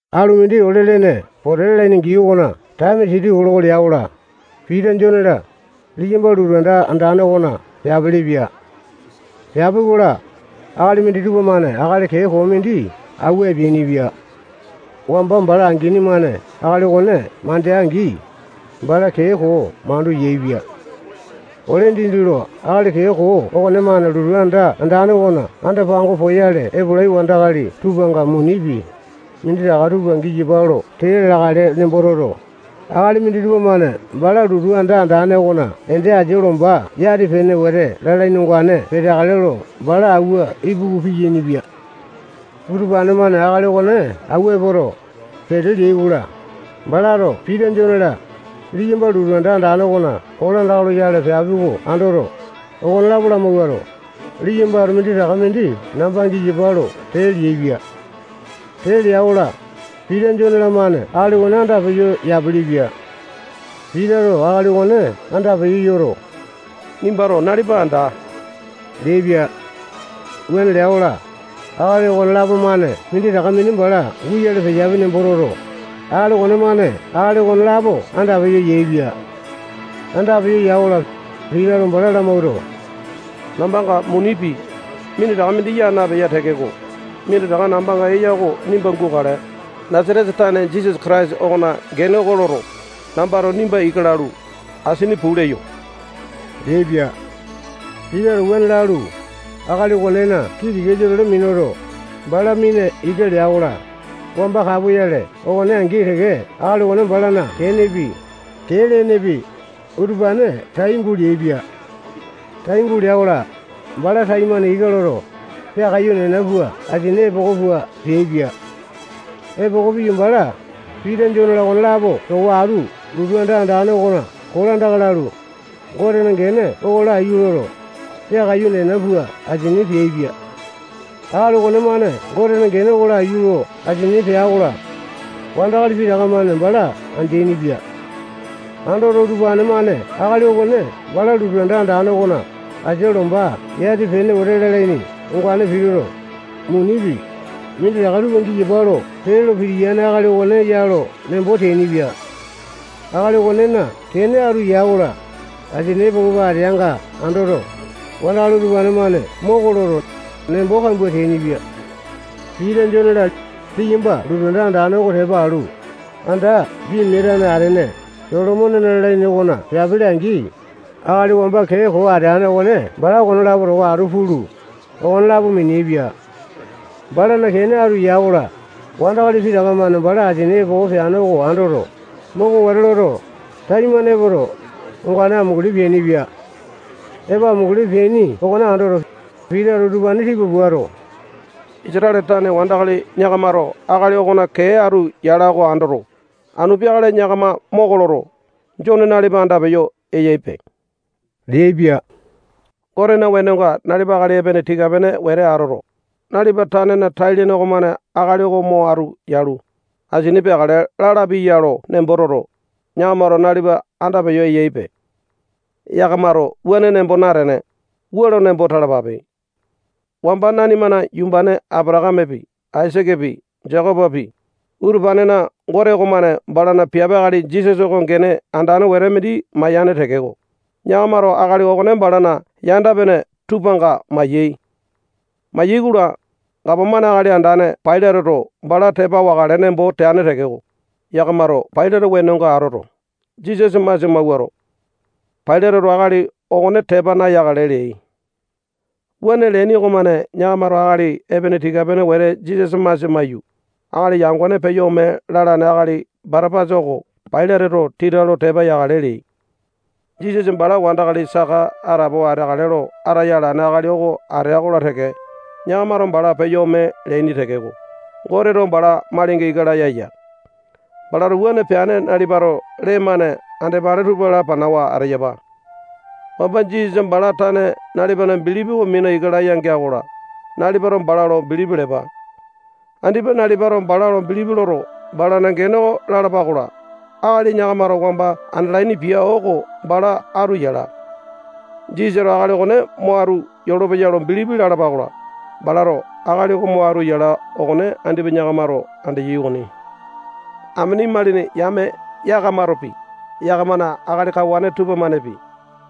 Alu mindi ole-lene pote lalaini gii okona taeme siti kiloko lea-kola, Pita, Jone-la, liyamba lotu anda andane okona peapilipia. Peapi-kola, akali minditupa-mane akali kee koo mindi awua epeainipia. Wamba bala angini-mane akali okone mandea-angi, bala kee koo mandu yaepia. Ole dindi lo akali kee koo okonemane lotu anda andane okona anda-pango poyale epolai wandakali tupanga munipi, minditaka tupa giyapa lo tee leakale nembo toto, akali minditupa-mane bala lotu anda andane okona ende asia lomba yati-pene wete lalaini ongane peteakale lo bala awua ipuku piyainipia. Utupane-mane akali okone awua epoto, pete leai-kola, balato Pita, Jone-la, liyamba lotu anda andane okona kolandaka loyale peapi oko andoto, okonelapo lamawuato, liyambato minditaka mindi namba giyapa lo tee leaipia. Tee lea-kola, Pita, Jone-lamane akali okone andapeyo yapelepia. Pitato akali okone andapeyo yoto, nimbato nalipa anda leaipia. Wuane lea-kola, akali okonelapo-mane minditaka mindi bala guyale leyapi nembo toto, akali okonemane akali okonelapo andapeyo yaepia. Andapeyo ya-kola, Pitato bala lamawuato, nambanga munipi, minditaka mindi yaa napeya tekeko, minditaka nambanga eya oko nimba gukale. Nasatesa tane Jisasa Kataisa okona gene oko loto, nambato nimba ika lalu, asini puu leyo leaipia. Pitato wuane lalu, akali okonena kii tikasa-tole minuto, bala mina ika lea-kola, wamba kapoyale okone angi teke akali okone balana kenepi, kee lenepi, utupane tai guleaipia. Tai gulea-kola, bala taimane ika loto, peakaiyu nena pua asini epoko pua peaipia. Epoko piyu, bala Pita, Jone-la, okonelapo towa atu lotu anda andane okona kolandaka lalu, Gotena gene oko laiyu loto, peakaiyu nena pua asini peaipia. Akali okonemane Gotena gene oko laiyu lo asini pea-kola, wandakali pitaka-mane bala andeaini-pia. Andoto, utupane-mane akali okone bala lotu anda andane okona asia lomba yati-pene wete lalaini ongane pituto, munipi, minditaka tupa giyapa lo tee lo pitiyane akali okone ya lo nembo teainipia. Akali okonena kene atu ya-kola, asini epoko pua ateanga andoto, wandakali utupane-mane moko loto, nembo kambua teainipia. Pita, Jone-la, liyamba lotu anda andane oko tepa alu, anda pimia atane atene Solomonena lalaini okona peapili-angi, akali wamba kee koo ateane okone bala okonelapo towa atu pulu, okonelapo miniaepia. Balana kene atu ya-kola, wandakali pitaka-mane bala asini epoko peane oko andoto, moko wete loto, taimane epoto, ongane amunguli peainipia. Epo amunguli peaini okone andoto, Pitato utupane tipa puato, Isatale tane wandakali yakamato akali okona kee atu yala oko andoto, anu peakale yakama moko loto, Jone nalipa andapeyo eyaipe leaipia. Gotena wenonga nalipa akali epene tika-pene wete atoto, nalipa tanena tai-lene okomane akali oko mo atu yalu, asini peakale lalapi ya lo nembo toto, yakamato nalipa andapeyo eyaipe. Yakamato wuane nembo natene, wua lo nembo talapape. Wamba nanimana yumbane Apatakamepi, Aisakepi, Jekopopi, utupanena Gote okomane balana piape akali Jisasa oko gene andane wete mindi mayane tekeko, yakamato akali okone balana yanda-pene tupanga maiyai. Mayai-kola, gapomane akali andane Pailateto bala tepa wakale nembo teane tekeko, yakamato Pailate wenonga atoto, Jisasa masia mawuato, Pailateto akali okone tepa nayakale leai. Wuane leaini okomane yakamato akali epene tika-pene wete Jisasa masia maiyu, akali yangone peyo ome lalane akali Batapasa oko Pailateto tita lo tepa yakale leai. Jisasa bala wandakali saka atapowa ateakale lo ataya alane akali oko atea-kola teke, yakamato bala peyo ome leaini tekeko, Goteto bala malinga ika laya ya. Balato wuane peane nalipato lee-mane andepale tupa lapanawa ateyapa. Wamba Jisasa bala tane nalipana bilipi oko mina ika laya gea-kola, nalipato bala lo bilipi lepa. Andipa nalipato bala lo bilipi loto, balana gene oko lalapa-kola, akali yakamato wamba andalaini pia oko bala atu yala. Jisasato akali okone mo atu yolopeya lo bilipi lalapa-kola, balato akali oko mo atu yala okone andipa yakamato andeyai okoni. Amene imalini yame yakamatopi, yakamana akali kawane tupamanepi,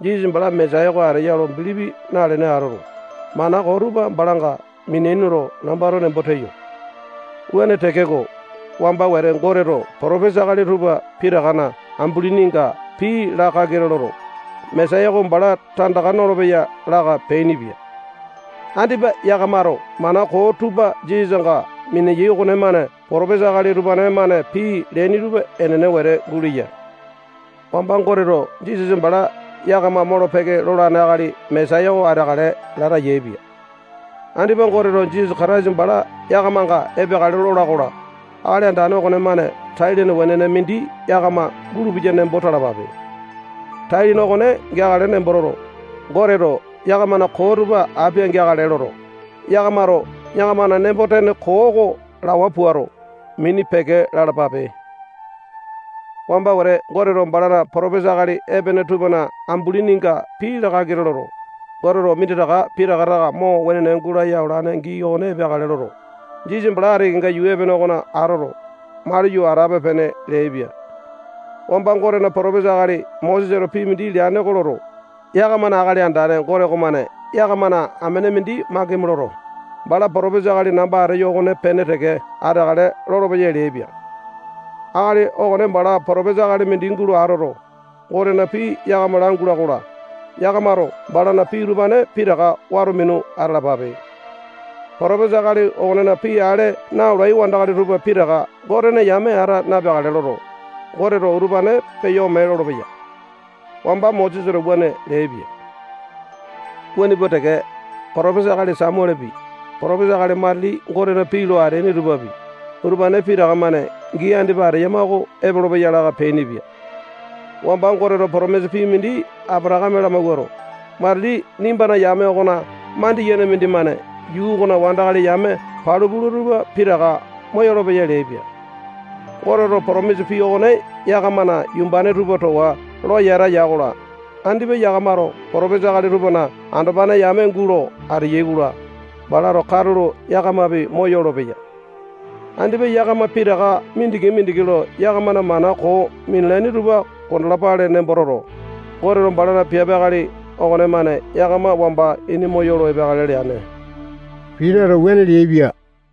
Jisasa bala Mesaya oko ateya lo bilipi nalene atoto, mana koo tupa balanga miniaini lo nambato nembo teyo. Wuane tekeko, wamba wete Goteto potopesa akali tupa pitakana ambulininga pii laa kakita loto, Mesaya oko bala tandaka nolopeya laka peainipia. Andipa yakamato mana koo tupa Jisasanga miniyai okonemane potopesa akali utupane-mane pii leaini tupa enene wete guleya. Wamba Goteto Jisasa bala yakama molo-peke lolane akali Mesaya oko ateakale lata yaepia. Andipa Goteto Jisasa Kataisa bala yakamanga epeakale lola-kola, Akali Andane okonemane tai-lene wenene mindi yakama gulupeya nembo talapape. Tai-lene okone geakale nembo toto, Goteto yakamana koo tupa apia-geakale loto, yakamato yakamana nembo-tene koo oko lawa puato, mini peke lalapape. Wamba wete Goteto balana potopesa akali epene tupana ambulininga pii laa kakita loto, Goteto minditaka pitaka taka mo wenene gulaya olane gii okone epeakale loto, Jisasa bala ati kenga yuu epene okona atoto, maliyo atape-pene leaipia. Wamba Gotena potopesa akali Mosesato pii mindi leane oko loto, yakamana Akali Andane Gote okomane yakamana amene mindi makimi loto, bala potopesa akali namba ateyo okopene teke ateakale lolopeya leaipia. Akali okone bala potopesa akali mindi gulo atoto, Gotena pii yakama langula-kola, yakamato balana pii utupane pitaka wato minu atalapape. Potopesa akali okonena pii ale na-olai wandakali tupa pitaka Gotena yame ata napeakale loto, Goteto utupane peyo ome lolopeya. Wamba Mosesato wuane leaipia. Wuane pua teke, potopesa akali Samualepi, potopesa akali matili Gotena pii lo ateaini tupapi, utupane pitaka-mane gii andipa ateyama oko epolopeya laka peainipia. Wamba Goteto potomisa pii mindi Apatakame lamawuato, matili nimbana yame okona mandiyene mindimane yuu okona wandakali yame palu pula tupa pitaka moyolo-peya leaipia. Goteto potomisa pii okone yakamana yumbane tupa towa lo yata ya-kola, andipa yakamato potopesa akali tupana andopane yame gulo ateyai-kola, balato katulo yakamapi moyolopeya. Andipa yakama pitaka mindiki-mindiki lo yakamana mana koo minalaini tupa kondalapale nembo toto, Goteto balana piape akali okonemane yakama wamba ini moyolo epeakale leane. Pitato wuane leaipia.